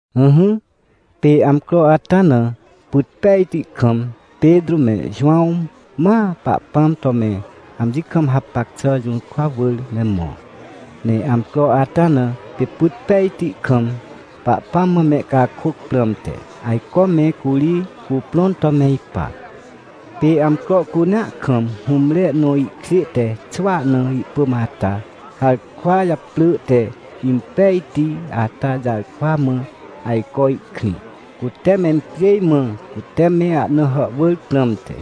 Ỹhỹ, pê amcro ata na, pyt pejti kam, Petrô me Jowãw ma Pahpãm to me amji kam hapac xà jũrkwa wỳr me mõ. Ne amcro ata na, pê pyt pejti kam Pahpãm mã mehcakôc prãmte, ajco me curi cuprõn to me ipa. Pê amcro cunea kam hũmre nõ ihkjê te xwỳa na ihpỳm ata, harkwa japrỳ te Impejti ata jarkwa mã ajco ihkrĩ, cute mencjêj mã cute me ahna hàhwỳr prãmte.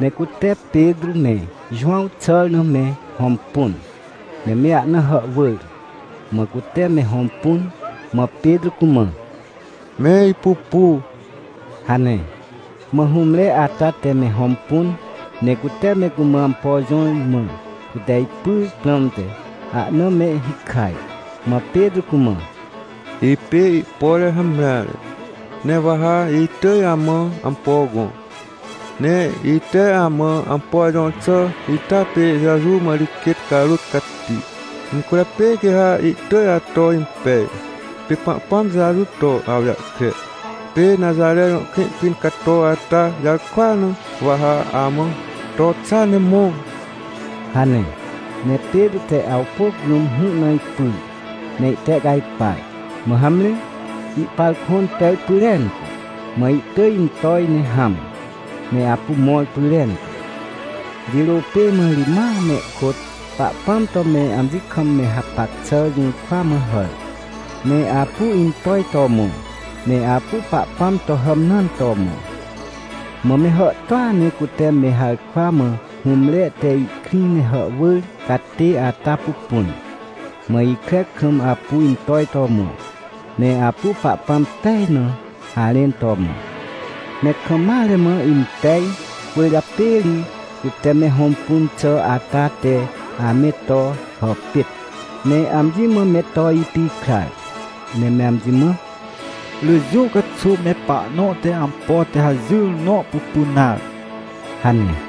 Ne cute Petrô me Jowãw xàr na me hõmpun, ne me ahna hàhwỳr. Mã cute me hõmpun, mã Petrô cumã: — Me ipupu — hane. Mã hũmre ata te me hõmpun, ne cute me cumã ampo jõr, mã cute ipyr prãmte, ahna me hikaj. Mã Petrô cumã: — Ipê ihpore hamreare, ne wa ha itỳj amã ampo gõ. Ne ite amã ampo jõr xà ita pê Jeju mã ri quêt carôt cati, incwỳrjapê quê ha ihtỳj ato impej. Pê Pahpãm Jeju to awjahkre, pê Naxare jõ krĩ pĩn cato ata jarkwa na wa ha amã: “To xa ne mõ” — hane. Ne Petrô te awpôc rũm hũ na ipyr, ne ihtehcajpar. Mã hamre, ihpar kõn pej pyrentu, mã ihtỳj intoj ne hãm, ne apu mõr pyrentu. Jirô pê mã ri ma mehkôt Pahpãm to me amji kam me hapac xà jũrkwa mã hàr, ne apu intoj to mõ, ne apu Pahpãm to hàmnãn to mõ. Mã me hàhtôa ne cute me harkwa mã hũmre te ihkrĩ ne hàhwỳr catê ata pupun, mã ikre kam apu intoj to mõ, ne apu Pahpãm pej na harẽn to mõ. Me kam mare mã impej, cwỳrjapê ri cute me hõmpun xà ata te ame to hàpêt, ne amji mã me to ipikrar. Ne me amji mã: — Rỳ jũ caxuw me pahnõ te ampo te hajỹr nõ pupun nare — hane.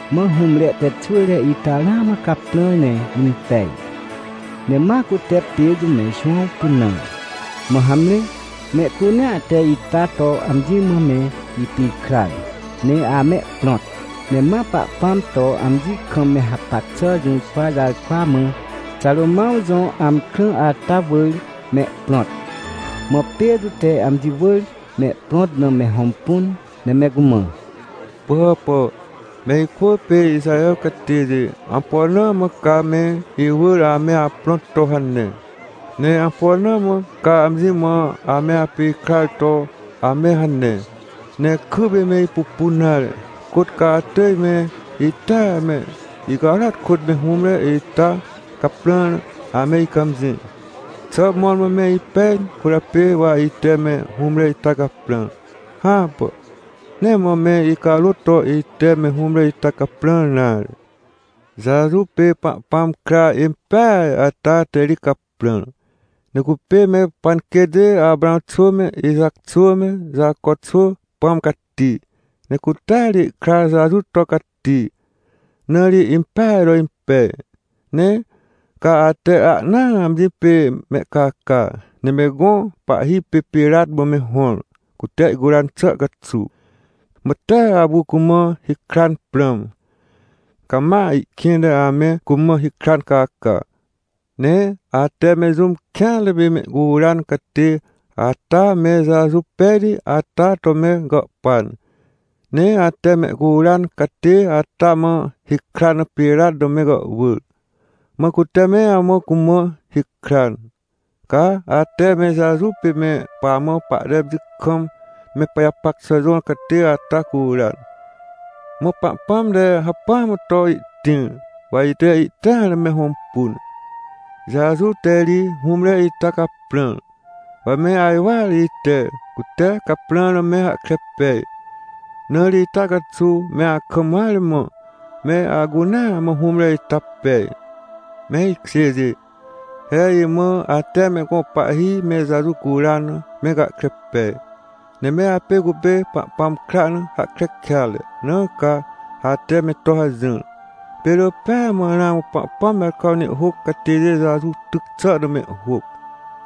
Mã hũmre te xwỳre ita ramã caprãr ne impej, ne ma cute Petrô me Jowãw pynãr, mã hamre, mehcunea te ita to amji mã me ipikrar ne amehprõt. Ne ma Pahpãm to amji kam me hapac xà jũrkwa jarkwa mã, Xarômãw jõ amkrã ata wỳr mehprõt. Mã Petrô te amji wỳr mehprõt na me hõmpun, ne me cumã: — Pỳhàpà, me ikwỳ pê Ixaher catêjê, ampo na mã came iwỳr ame aprõt to hane? Ne ampo na mã ca amji mã ame apikrar to ame hane, ne kypê me ipupun nare? Côt ca atỳj me itea, me icarôat kôt me hũmre ita caprãr na ame icãmjĩ? Xà mõrmõ me ipej cwỳrjapê wa ite me hũmre ita caprãr? Hãpà, nee mã me icarôt to ite me hũmre ita caprãr nare. Jeju pê Pahpãm kra impeaj ata te ri caprãr. Ne cupê me panquêtjê Aprãw xwỳ me, Ixac xwỳ me, Jaco xwỳ Pãm Cati, ne cutea ri ihkra Jeju to cati, na ri impeaj to impej. Ne ca ate ahnaa amji pê mehcaca, ne me gõ pahhi pê Pirat mã me hõr, cute ihcuran xà caxuw. Mã tee apu cumã hikran prãm. Ca ma ihkĩnte ame cumã hikran caca. Ne ate me jũm kêanre pê mehcuran catê ata me Jeju pejti ata to me gàhpan, ne ate mehcuran catê ata mã hikran na Pirat na me gàhwỳr. Mã cute me amã cumã hikran. Ca ate me Jeju pê me pamã pahte amji kam me pajapac xà jõr catê ata curan. Mã Pahpãm te hacpỹa mã to ihtĩr, wa ite ihtĩar na me hõmpun. Jeju te ri hũmre ita caprãr. Wa me ajwar ite, cute caprãr na me hahkre pej. Na ri ita caxuw me akam mare mã, me acunaa mã hũmre ita pej. — Me ikjêjê, he imã, ate me gõ pahhi me Jeju curan na, me gahkre pej. Ne me apê cupê Pahpãm kra na hahkre kêatre, na ca ate me to hajỹr. Pê rỳ pêa mã ramã Pahpãm jarkwa na ihhôc catêjê Jeju tyc xà na mehhôc.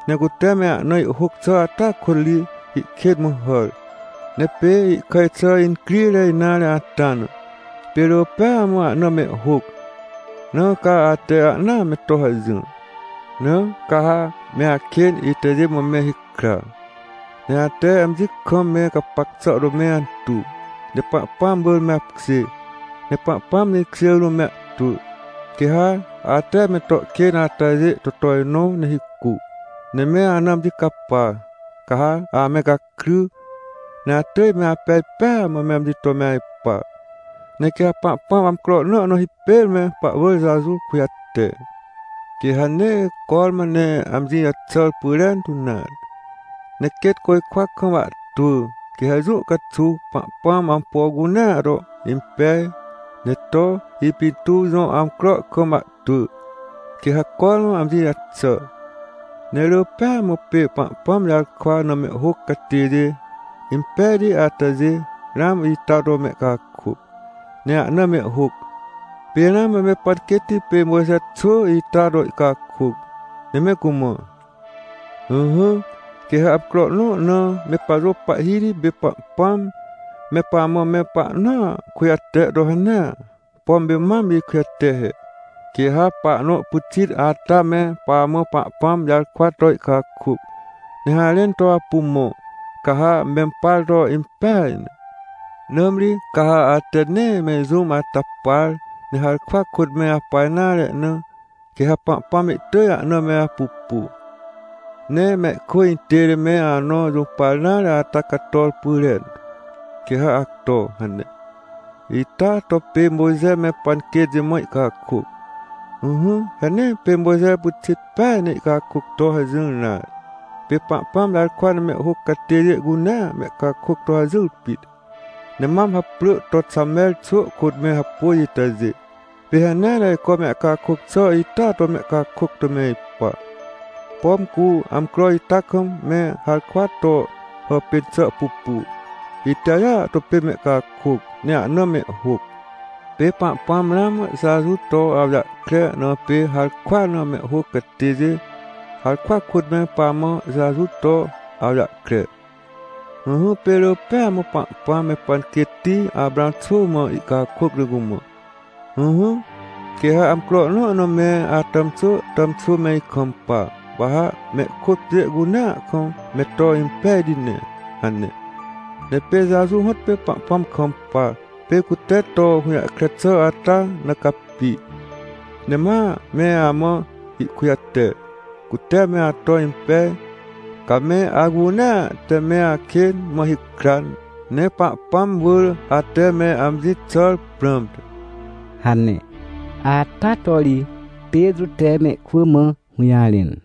Ne cute me ahna ihhôc xà ata kôt ri ihkên mã hàr. Ne pê ihkàj xà incrire nare ata na, pê rỳ pêa mã ahna mehhôc, na ca ate ahnaa me to hajỹr. Na ca ha me akên itajê mã me hikra, ne ate amji kam me gapac xà to me antuw, ne Pahpãm wỳr me apkjê, ne Pahpãm jĩkjê rũm me ahtwỳ, quê ha ate me to kên atajê to tojnõ ne hicu, ne me ana amji capa. Ca ha ame gakry, ne atỳj me apej pêa mã me amji to me ajpa. Ne quê ha Pahpãm amcro nõ na hipêr me pahwỳr Jeju kujate. Quê ha nee cormã ne amji jaxàr pyrentu nare, ne quêt côjkwa kam ahtwỳ. Quê ha jũ caxuw Pahpãm ampo cunea to impej, ne to ipintuw jõ amcro kam ahtwỳ, quê ha cormã amji jaxà. Ne rỳ pêa mã pê Pahpãm jarkwa na mehhôc catêjê impejti atajê, ramã ita to mehcakôc, ne ahna mehhôc. Pê ramã me panquêtti pê Mojxe xwỳ ita to ihcakôc, ne me cumã: “Ỹhỹ, quê ha amcro nõ na me pajõ Pahhiti pê Pahpãm me pamã me pahnõa kujate to hanea, pom pê mam ikujate he. Quê ha pahnõ pyxit ata me pamã Pahpãm jarkwa to ihcakôc, ne harẽn to apu mõ, ca ha mempar to impeaj ne. Nãmri ca ha ate nee me jũm ata par, ne harkwa kôt me apa nare na, quê ha Pahpãm ihtỳj ahna me apupu, ne mehkwỳ intête me anõ jũpar nare ata cator pyrentu, quê ha acto” hane. Ita to pê Mojxe me panquêtjê mã ihcakôc. — Ỹhỹ, he nee pê Mojxe pyxit peaj ne ihcakôc to hajỹr nare. Pê Pahpãm jarkwa na mehhôc catêjê cunea mehcakôc to hajỹr pit. Ne mam haprỳ to Xamer xwỳ kôt me hapôj itajê, pê hanea ne ajco mehcakôc xà ita to mehcakôc to me ipa. Pom cu amcro ita kam me harkwa to hàpên xà pupu, itajêa to pê mehcakôc, ne ahna mehhôc. Pê Pahpãm ramã Jeju to awjahkre na pê harkwa na mehhôc catêjê, harkwa kôt me pamã Jeju to awjahkre. Ỹhỹ, pê rỳ pêa mã Pahpãm me panquêtti Aprãw xwỳ mã ihcakôc ne cumã: “Ỹhỹ, quê ha amcro nõ na me atàmxwỳ tàmxwỳ me ikampa, wa ha mehkôt pjê cunea kam me to impejti ne” hane. Ne pê Jeju hõtpê Pahpãm kampa, pê cute to hũjahkre xà ata na capi, ne ma me amã ihkujate, cute me ato impej, ca me acunea te me akên mã hikran, ne Pahpãm wỳr ate me amji jaxàr prãmte — hane. Ata to ri Petrô te mehkwỳ mã hũjarẽn.